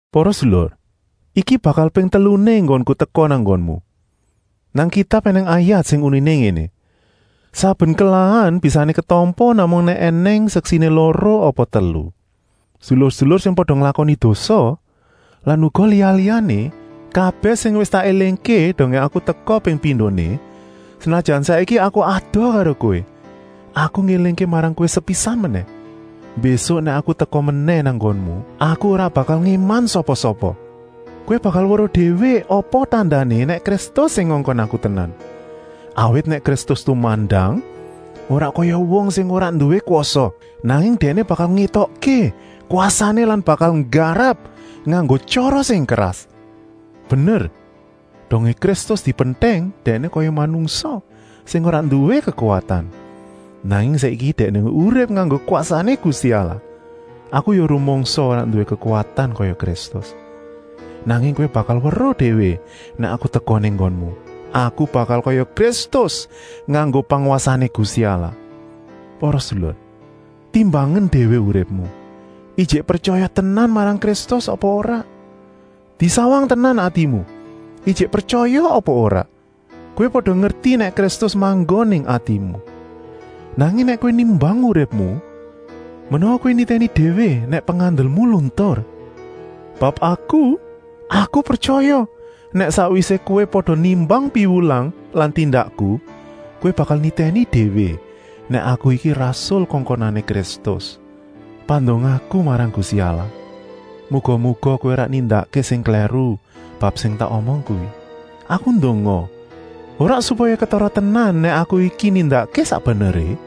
Para sedulur, iki bakal ping teluné enggonku teka nang nggonmu. Nang Kitab ènèng ayat sing uniné ngéné: “Saben kelahan bisané ketampa namung nèk ènèng seksiné loro apa telu.” Sedulur-sedulur sing pada nglakoni dosa lan uga liya-liyané, kabèh sing wis tak élingké dongé aku teka ping pindoné, senajan saiki aku adoh karo kowé, aku ngélingké marang kowé sepisan menèh: mbésuk nèk aku teka menèh nang nggonmu aku ora bakal ngéman sapa-sapa. Kowé bakal weruh déwé apa tandané nèk Kristus sing ngongkon aku tenan, awit nèk Kristus tumandang, ora kaya wong sing ora nduwé kwasa, nanging Dèkné bakal ngétokké kwasané lan bakal nggarap nganggo tyara sing keras. Bener, dongé Kristus dipentèng Dèkné kaya manungsa sing ora nduwé kekuwatan, nanging saiki Dèkné urip nganggo kwasané Gusti Allah. Aku ya rumangsa ora nduwé kekuwatan kaya Kristus, nanging kowé bakal weruh déwé nèk aku teka nang nggonmu, aku bakal kaya Kristus nganggo pangwasané Gusti Allah. Para sedulur, timbangen déwé uripmu, ijik pretyaya tenan marang Kristus apa ora. Disawang tenan atimu, ijik pretyaya apa ora. Kowé pada ngerti nèk Kristus manggon ing atimu. Nanging nèk kowé nimbang uripmu, menawa kowé nitèni déwé nèk pengandelmu luntur. Bab aku, aku pretyaya, nèk sakwisé kowé pada nimbang piwulang lan tindakku, kowé bakal nitèni déwé nèk aku iki rasul kongkonané Kristus. Pandongaku marang Gusti Allah, muga-muga kowé ora nindakké sing klèru bab sing tak omong kuwi. Aku ndonga, ora supaya ketara tenan nèk aku iki nindakké sak beneré,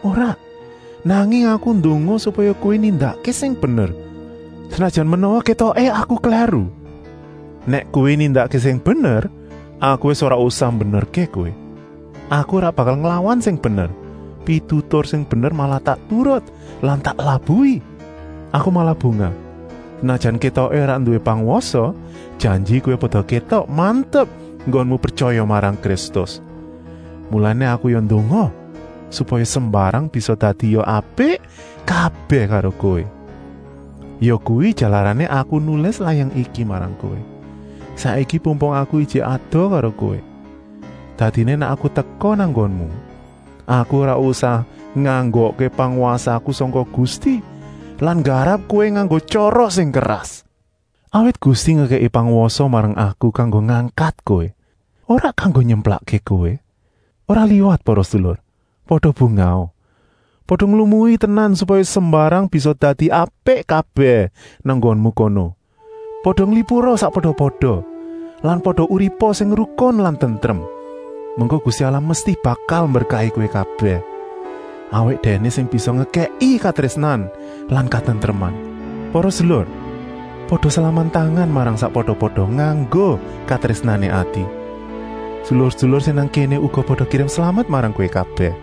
ora, nanging aku ndonga supaya kowé nindakké sing bener, senajan menawa kétoké aku klèru. Nèk kowé nindakké sing bener, aku wis ora usah mbenerké kowé. Aku ora bakal nglawan sing bener, pitutur sing bener malah tak turut lan tak labuhi. Aku malah bungah senajan kétoké ora nduwé pangwasa, janji kowé pada kétok mantep enggonmu pretyaya marang Kristus. Mulané aku ya ndonga supaya sembarang bisa dadia apik kabèh karo kowé. Yakuwi jalarané aku nulis layang iki marang kowé, saiki pumpung aku ijik adoh karo kowé. Dadiné nèk aku teka nang nggonmu aku ora usah nganggokké pangwasaku sangka Gusti lan nggarap kowé nganggo tyara sing keras. Awit Gusti ngekèki pangwasa marang aku kanggo ngangkat kowé, ora kanggo nyemplakké kowé. Ora liwat para sedulur, pada bungaha. Pada nglumui tenan supaya sembarang bisa dadi apik kabèh nang nggonmu kono. Pada nglipura sakpada-pada lan pada uripa sing rukun lan tentrem. Mengko Gusti Allah mesti bakal mberkahi kowé kabèh, awit Dèkné sing bisa ngekèki katrésnan lan katentreman. Para sedulur, pada salaman tangan marang sakpada-pada nganggo katrésnané ati. Sedulur-sedulur sing nang kéné karo uga pada kirim slamet marang kowé kabèh.